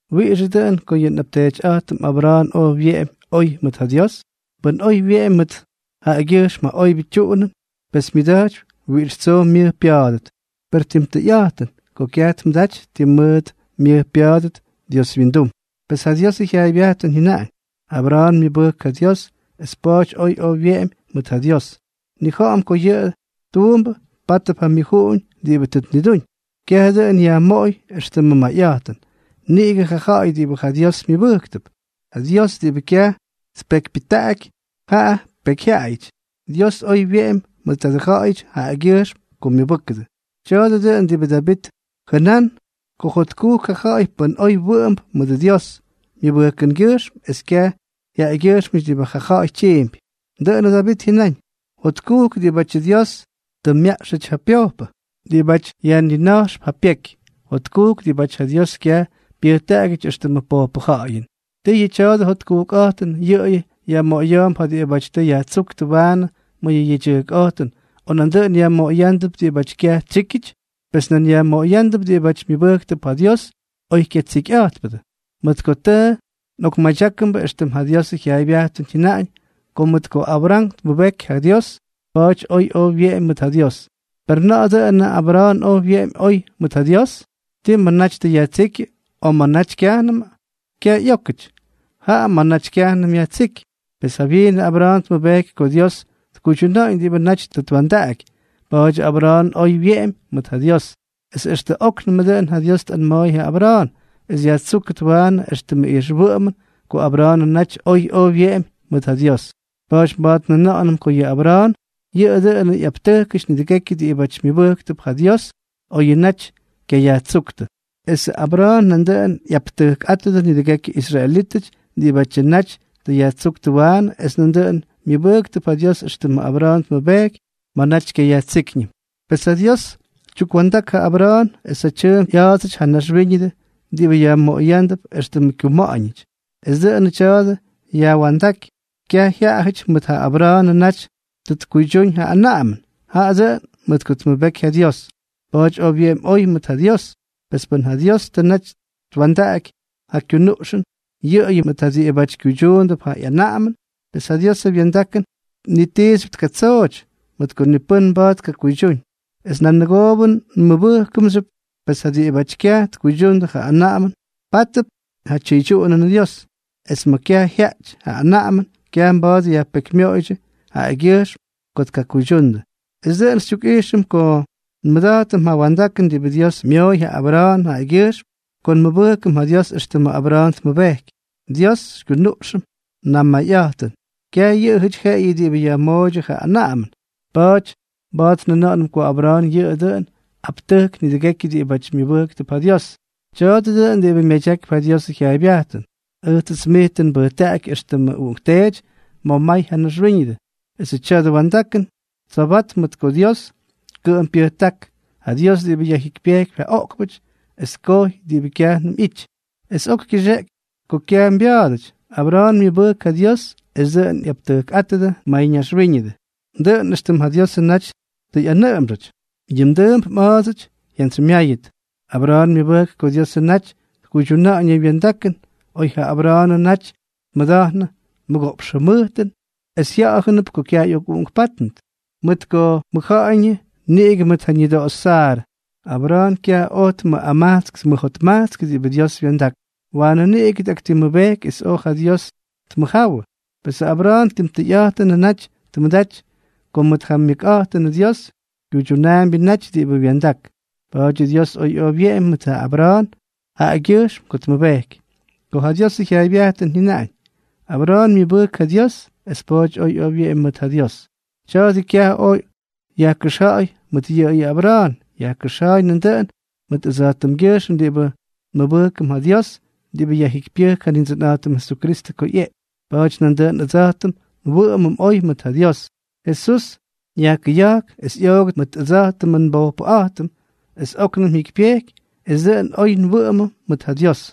¿Wiꞌixʉ dʉꞌʉn ko yʉ nꞌapteetyꞌa̱jtʉm Abra̱a̱n oj wyeꞌemy oy mʉt ja Dios? Pʉn oy wyeꞌemy mʉt yʉꞌʉgyʉjxm yʉ oybyʉ tyuꞌunʉn, pes myʉda̱jtypy wiꞌix tsoo myʉj pya̱a̱dʉt. Per tim tʉyꞌa̱jtʉn ko kyaj tmʉdaty ti mʉʉt myʉj pya̱a̱dʉt Dios wyindum. Pes ja Diosʉ jyaaybyajtʉn jyʉnaꞌañ: “Abra̱a̱n myʉbʉjk ja Dios, es pa̱a̱ty oj oy wyeꞌemy mʉt ja Dios.” Nnija̱ꞌa̱m ko yʉ tuumbʉ pátʉp ja myʉjuꞌuñ diꞌibʉ tʉ tnidúñ, kyaj dʉꞌʉn yajmoꞌoy éxtʉmʉ mayꞌa̱jtʉn. Niꞌigʉ, ja ja̱ꞌa̱y diꞌibʉ ja Dios myʉbʉjktʉp, ja Dios diꞌibʉ kyaj tpekypyʉjtaꞌaky ja pekyjyaꞌayʉty, Dios oy wyeꞌemy mʉt tadʉ ja̱ꞌa̱yʉty jaꞌagyʉjxm ko myʉbʉ́kʉdʉ. Tya̱a̱dʉ dʉꞌʉn diꞌibʉ Davit jʉnán ko jotkujk ja ja̱ꞌa̱y pʉ́n oy wʉꞌʉmp mʉdʉ Dios myʉbʉjkʉngyʉjxm es kyaj jyaꞌagyʉjxmʉty diꞌibʉ ja ja̱ꞌa̱y tyiimpy. Dʉꞌʉnʉ Davit jyʉnáñ: Jotkujk diꞌibátyʉ Dios tʉ myaꞌxʉty ja pyojpʉ, diꞌibáty yajnina̱jxp ja pyeky, jotkujk diꞌibáty ja Dios kyaj pyʉjtaꞌagyʉty éxtʉmʉ pojpʉ ja̱ꞌa̱yʉn. ¿Tii yʉ tya̱dʉ jotkujkꞌa̱jtʉn yʉꞌʉyʉ yajmoꞌoya̱a̱mp ja diꞌibáty tʉ yajtsúktʉ waanʉ ma̱ yʉ yedyʉjkꞌa̱jtʉn, o nandʉꞌʉn yajmoꞌoyándʉp diꞌibáty kyaj tsyíkyʉty? Pes nan yajmoꞌoyándʉp diꞌibáty myʉbʉjktʉp ja Dios oy kyatsikyꞌa̱jtpʉdʉ. Mʉt ko tʉ nꞌokmadyákʉmbʉ éxtʉm ja Diosʉ jyaaybyajtʉn jyʉnaꞌañ ko mʉt ko Abra̱a̱n tmʉbejky ja Dios, pa̱a̱ty oj oy wyeꞌemy mʉt ja Dios. ¿Per na̱ꞌa̱ dʉꞌʉnʉ Abra̱a̱n oj wyeꞌemy oy mʉt ja Dios? ¿Tii ma̱ naty tʉ yajtsíkyʉ, o ma̱ naty kyajnʉmʉ? Kyaj ꞌyókʉty, jaa ma̱ naty kyajnʉm yajtsíky. Pes jawyiinʉ Abra̱a̱n tmʉbejky ko Dios tkuydyuna̱ꞌa̱ñ diꞌibʉ naty tʉ twa̱ndaꞌaky, pa̱a̱dyʉ Abra̱a̱n oy wyeꞌemy mʉt ja Dios. Es extʉ óknʉmʉ dʉꞌʉn ja Dios tꞌanma̱a̱y ja Abra̱a̱n es yajtsúkʉt waanʉ éxtʉmʉ ijxwʉꞌʉmʉn ko Abra̱a̱nʉ naty oy oj wyeꞌemy mʉt ja Dios. Pa̱a̱ty mba̱a̱t njʉna̱ꞌa̱nʉm ko yʉ Abra̱a̱n yʉꞌʉ dʉꞌʉnʉ ꞌyaptʉjkʉty nidʉgekyʉ diꞌibáty myʉbʉjktʉp ja Dios oyʉ naty kyayajtsujkpʉ. Esʉ Abra̱a̱n nandʉꞌʉn ꞌyaptʉjkꞌátʉdʉ nidʉgekyʉ israelítʉty diꞌibátyʉ naty tʉ yajtsúktʉ waanʉ es nandʉꞌʉn myʉbʉjktʉp ja Dios éxtʉmʉ Abra̱a̱n tmʉbejky ma̱ naty kyayajtsíkyñʉm. Pes ja Dios tyukwa̱ndak ja Abra̱a̱n es ja tyʉʉmp ꞌya̱a̱dsʉty ja naxwíñʉdʉ diꞌibʉ yajmoꞌoyándʉp éxtʉmʉ kyuma̱ꞌa̱ñʉty. Pes dʉꞌʉnʉ tya̱a̱dʉ yajwa̱ndáky kyaj jyaꞌajʉty mʉt ko Abra̱a̱nʉ naty tʉ tkuydyúñ ja anaꞌamʉn, jaꞌa dʉꞌʉn mʉt ko tmʉbejky ja Dios. Pa̱a̱ty oj wyeꞌemy oy mʉt ja Dios. Pes pʉn ja Dios tʉ naty twa̱ndaꞌaky ja kyunuꞌxʉn yʉꞌʉyʉ mʉt diꞌibáty kyuydyuundʉp ja ꞌyanaꞌamʉn, pes ja Diosʉ wya̱ndakʉn ni tiixyʉp tkatsooty, mʉt ko ni pʉ́n mba̱a̱t tkakuydyúñ, es nanʉgoobʉ nmʉbʉjkʉmxyʉp. Pes ja diꞌibáty kyaj tkuydyundʉ ja anaꞌamʉn, pátʉp ja tyʉydyuꞌunʉnʉ Dios; es ma̱ kyaj jyaaty ja anaꞌamʉn, kyaj mba̱a̱t yajpekymyoꞌoydyʉ jaꞌagyʉjxm ko tkakuydyundʉ. Es dʉꞌʉn xytyukꞌijxʉm ko nmʉda̱jtʉm ja wa̱ndakʉn diꞌibʉ Dios myooy ja Abra̱a̱n jaꞌagyʉjxm ko nmʉbʉjkʉm ja Dios éxtʉmʉ Abra̱a̱n tmʉbejky. Dios xykyunuꞌxʉm namayꞌa̱jtʉn, kyaj yʉꞌʉyʉty jeꞌeyʉ diꞌibʉ yajmooydyʉ ja anaꞌamʉn. Pa̱a̱ty mba̱a̱t njʉna̱ꞌa̱nʉm ko Abra̱a̱n yʉꞌʉ dʉꞌʉn aptʉjk ma̱ nidʉgekyʉ diꞌibáty myʉbʉjktʉp ja Dios. Tya̱a̱dʉ dʉꞌʉn diꞌibʉ myadyakypy ja Diosʉ jyaaybyajtʉn: “Ʉjtsʉts mij tʉ nbʉjtaꞌaky éxtʉmʉ uꞌunkteety ma̱ may ja naxwíñʉdʉ.” Esʉ tya̱dʉ wa̱ndakʉn tsobatp mʉt ko Dios kʉꞌʉm pyʉjták, ja Dios diꞌibʉ yajjikypyejkypy ja oꞌkpʉty es tkojy diꞌibʉ kyajnʉm ꞌyity. Es oy kyʉxeꞌky ko kyaj mbya̱a̱dʉty, Abra̱a̱n myʉbʉjk ja Dios es dʉꞌʉn ꞌyaptʉjkꞌátʉdʉ mayñaxwíñʉdʉ. Dʉꞌʉn éxtʉm ja Diosʉ naty tʉ ꞌyanʉꞌʉmxʉty: “Yʉ mdʉʉmp mꞌa̱a̱dsʉty jyantsymyáyʉt.” Abra̱a̱n myʉbʉjk ko Diosʉ naty tkuydyuna̱ꞌa̱ñ yʉ wya̱ndakʉn oy ja Abra̱a̱nʉ naty tmʉda̱jnʉ mʉgoꞌpx jʉmʉjtʉn es jya̱ꞌa̱jʉnʉp ko kyaj ꞌyokꞌuꞌunkpátnʉt, mʉt ko mʉjja̱ꞌa̱yñʉ niꞌigʉ mʉt ja ñʉdoꞌoxy Saarʉ. Abra̱a̱n kyaj oj tmʉꞌamajtsk tmʉjotmajtskʉ diꞌibʉ Dios wya̱ndak, waanʉ niꞌigʉ tꞌaktimmʉbejky es oj ja Dios tmʉjjáwʉ. Pesʉ Abra̱a̱n tim tʉyꞌa̱jtʉnʉ naty tmʉdaty ko mʉt ja myʉkꞌa̱jtʉnʉ Dios kyuydyunaambyʉ naty diꞌibʉ wya̱ndak. Pa̱a̱dyʉ Dios oj oy wyeꞌemy mʉt ja Abra̱a̱n jaꞌagyʉjxm ko tmʉbejky. Ko ja Diosʉ jyaaybyajtʉn jyʉnaꞌañ: “Abra̱a̱n myʉbʉjk ja Dios, es pa̱a̱ty oj oy wyeꞌemy mʉt ja Dios”, tya̱a̱dʉ kyaj oj yajkʉxja̱ꞌa̱y mʉt yʉꞌʉyʉ Abra̱a̱n; yajkʉxja̱a̱y nandʉꞌʉn mʉt ʉdsa̱jtʉmgyʉjxm diꞌibʉ nmʉbʉjkʉm ja Dios diꞌibʉ yajjikypyʉjk ja Nindsʉnꞌa̱jtʉm Jesukristʉ ko ꞌyeꞌky. Pa̱a̱ty nandʉꞌʉn ʉdsa̱jtʉm nwʉꞌʉmʉm oy mʉt ja Dios. Jesús yajkʉya̱jk es ꞌyoogʉt mʉt ʉdsa̱jtʉmʉ nbojpʉꞌa̱jtʉm, es óknʉm jyikypyejky es dʉꞌʉn oy nwʉꞌʉmʉm mʉt ja Dios.